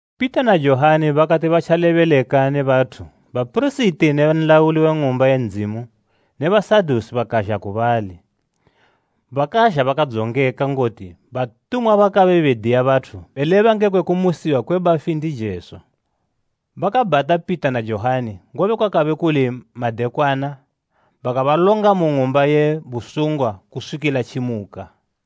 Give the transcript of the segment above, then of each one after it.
Pita na Johani bakati batjalebeleka ne bathu bapirisiti ne nlauli we ng'umba ye Ndzimu ne Basadusi bakazha ku bali. Bakazha bakadzongeka ngoti batumwa bakabe bediya bathu beleba ngekwe kumusiwa kwe bafi ndi Jesu. Bakabhata Pita na Johani, ngobe kwakabe kuli madekwana bakabalonga mu ng'umba ye busungwa kuswikila tjimuka.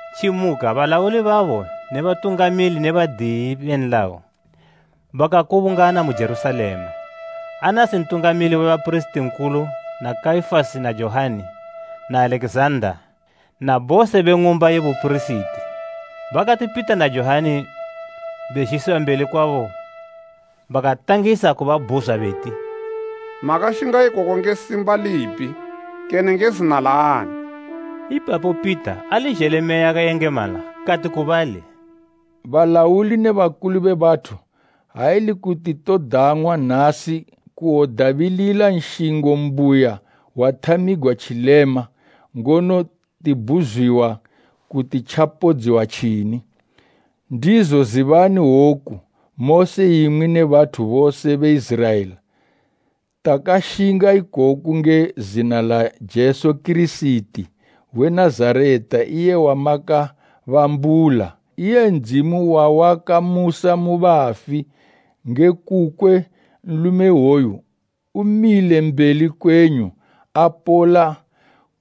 Tjimuka balauli babo ne batungamili ne badiyi be nlayo bakakubungana mu Jerusalema, Anasi mpirisiti nkulu na Kaifasi na Johani na Alekizanda na bose be ng'umba ye bupirisiti. Bakati Pita na Johani bezhisiwa mbeli kwabo bakatangisa kubabhuzwa beti, “Makashinga ikoku nge simba lipi kene nge zina laani?” Ipapo Pita, ali zhele Meya yakayengemala kati ku bali, “Balauli ne bakulu be bathu! Ha ili kuti todang'wa nasi kuwodabilila nshingo mbuya wathamigwa tjilema ngono tibhuzwiwa kuti tjapodziwa tjini, ndizo zibani woku mose imwi ne bathu bose be Iziraela, takashinga ikoku nge zina la Jesu Kirisiti we Nazareta iye wamakabambula, iye Ndzimu wawakamusa mu bafi, nge kukwe nlume iwoyu umile mbeli kwenyu apola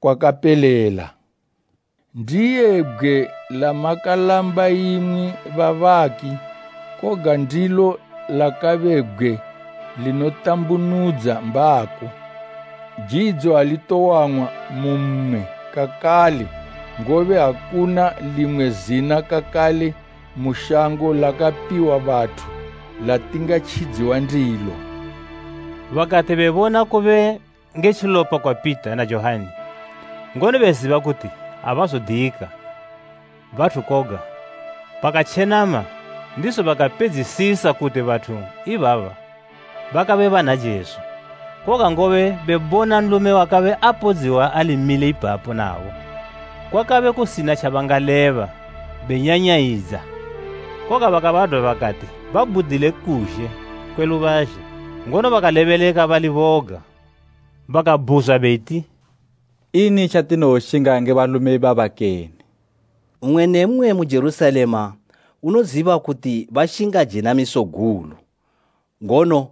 kwakapelela. Ndiye “ ‘Bgwe lamakalamba imwi babaki, koga ndilo lakabe bgwe linotambunudza mbako.’ “Jidzo ali towang'wa mu mmwe kakale, ngobe akuna limwe zina kakale mu shango lakapiwa bathu latingatjidziwa ndilo.” Bakati bebona kube nge tjilopa kwa Pita na Johani, ngono beziba kuti abazodiyika, bathu koga, bakatjenama ndizo bakapedzisisa kuti bathu ibaba bakabe bana Jesu. Koga ngobe bebona nlume wakabe apodziwa ali mile ipapo nabo, kwakabe kusina tjabangaleba benyanyayidza. Koga bakabadwa bakati babhudile kuzhe kwe lubazhe, ngono bakalebeleka bali boga. Bakabhuzwa beti, “Ini tjatinowoshinga nge balume ibaba kene? Mmwe ne mmwe mu Jerusalema unoziba kuti bashinga jenamiso gulu, ngono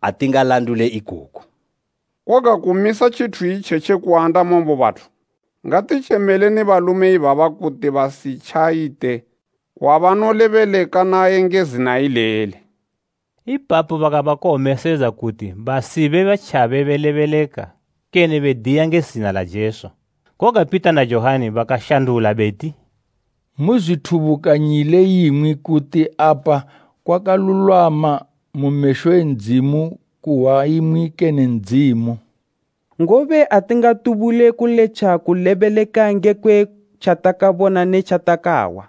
atingalandule ikoko. Koga kumisa tjithu itjetji kuandama mu bathu, ngatitjemeleni balume ibaba kuti basitjayite wabanolebeleka naye nge zina ileli.” Ipapo bakabakowomesedza kuti basibe batjabe belebeleka kene bediya nge zina la Jesu. Koga Pita na Johani bakashandula beti, “Muzwithubukanyile imwi kuti apa kwakalulwama mu mesho e Ndzimu kuhwa imwi kene Ndzimu. Ngobe atingatubule kuletja kulebeleka ngekwe tjatakabona ne tjatakahwa.”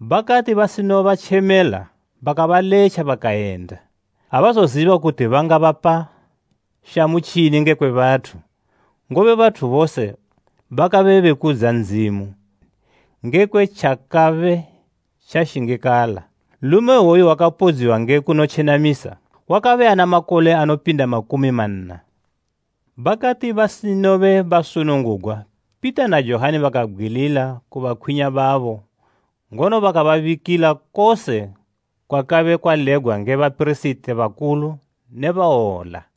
Bakati basinobatjemela bakabaletja bakayenda. Abazoziba kuti bangabapa shamu tjini ngekwe bathu, ngobe bathu bose bakabe bekudza Ndzimu ngekwe tjakabe tjashingikala. Nlume iwoyu wakapodziwa nge kunotjenamisa, wakabe ana makole anopinda makumi manna. Bakati basinobe basunungugwa Pita na Johani bakabgwilila ku bakwinya babo ngono bakababikila kose kwakabe kwalebgwa nge bapirisiti bakulu ne bawola.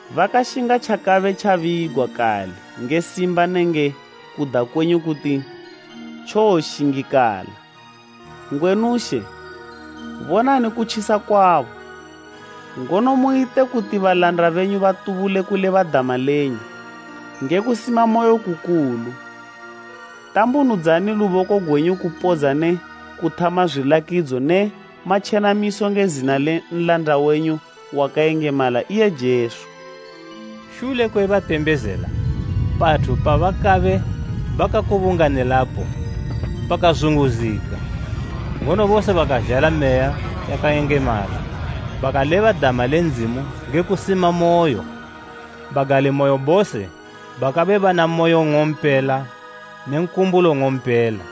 Bakashinga tjakabe tjabigwa kale nge simba nenge kuda kwenyu kuti tjowoshingikala. Ngwenu She, bonani kutjisa kwabo, ngono muyite kuti balanda benyu batubule kuleba dama lenyu nge kusimamoyo kukulu. Tambunudzani luboko gwenyu kupodza ne kuthama zwilakidzo ne matjenamiso nge zina le nlanda wenyu wakayengemala iye Jesu.” Shule kwe batembezela, pathu pabakabe bakakubunganilapo pakazunguzika. Ngono bose bakazhala Meya yakayengemala bakaleba dama le Ndzimu nge kusimamoyo. Bagalimoyo bose bakabe bana moyo ng'ompela ne nkumbulo ng'ompela.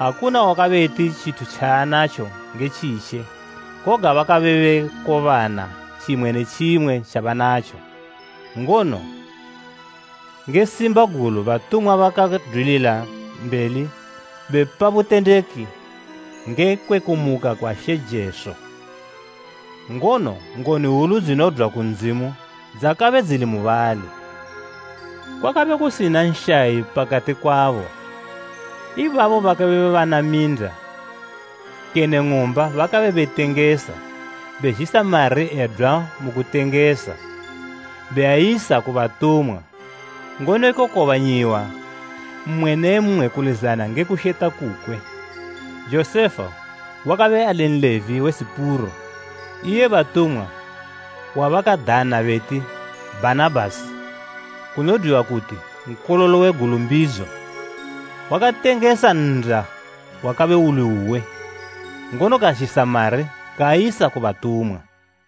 Akuna wakabe eti tjithu tjaanatjo nge tjitje, koga bakabe bekobana tjimwe ne tjimwe tjabanatjo. Ngono, nge simba gulu batumwa bakadwilila mbeli bepa butendeki ngekwe kumuka kwa She Jesu, ngono ngoni hwulu dzinodwa ku Ndzimu dzakabe dzili mubali. Kwakabe kusina nshayi pakati kwabo. Ibabo bakabe bana minda kene ng'umba bakabe betengesa, bezhisa mari edwa mu kutengesa beayisa ku batumwa, ngono ekokobanyiwa mmwe ne mmwe kulizana nge kusheta kukwe. Josefa, wakabe ali Nlevi we Sipuro, iye batumwa wabakadana beti Bhanabhasi, kunodwa kuti “Nkololo we Gulumbidzo,” wakatengesa nnda wakabe uli uwe, ngono kazhisa mari kaayisa ku batumwa.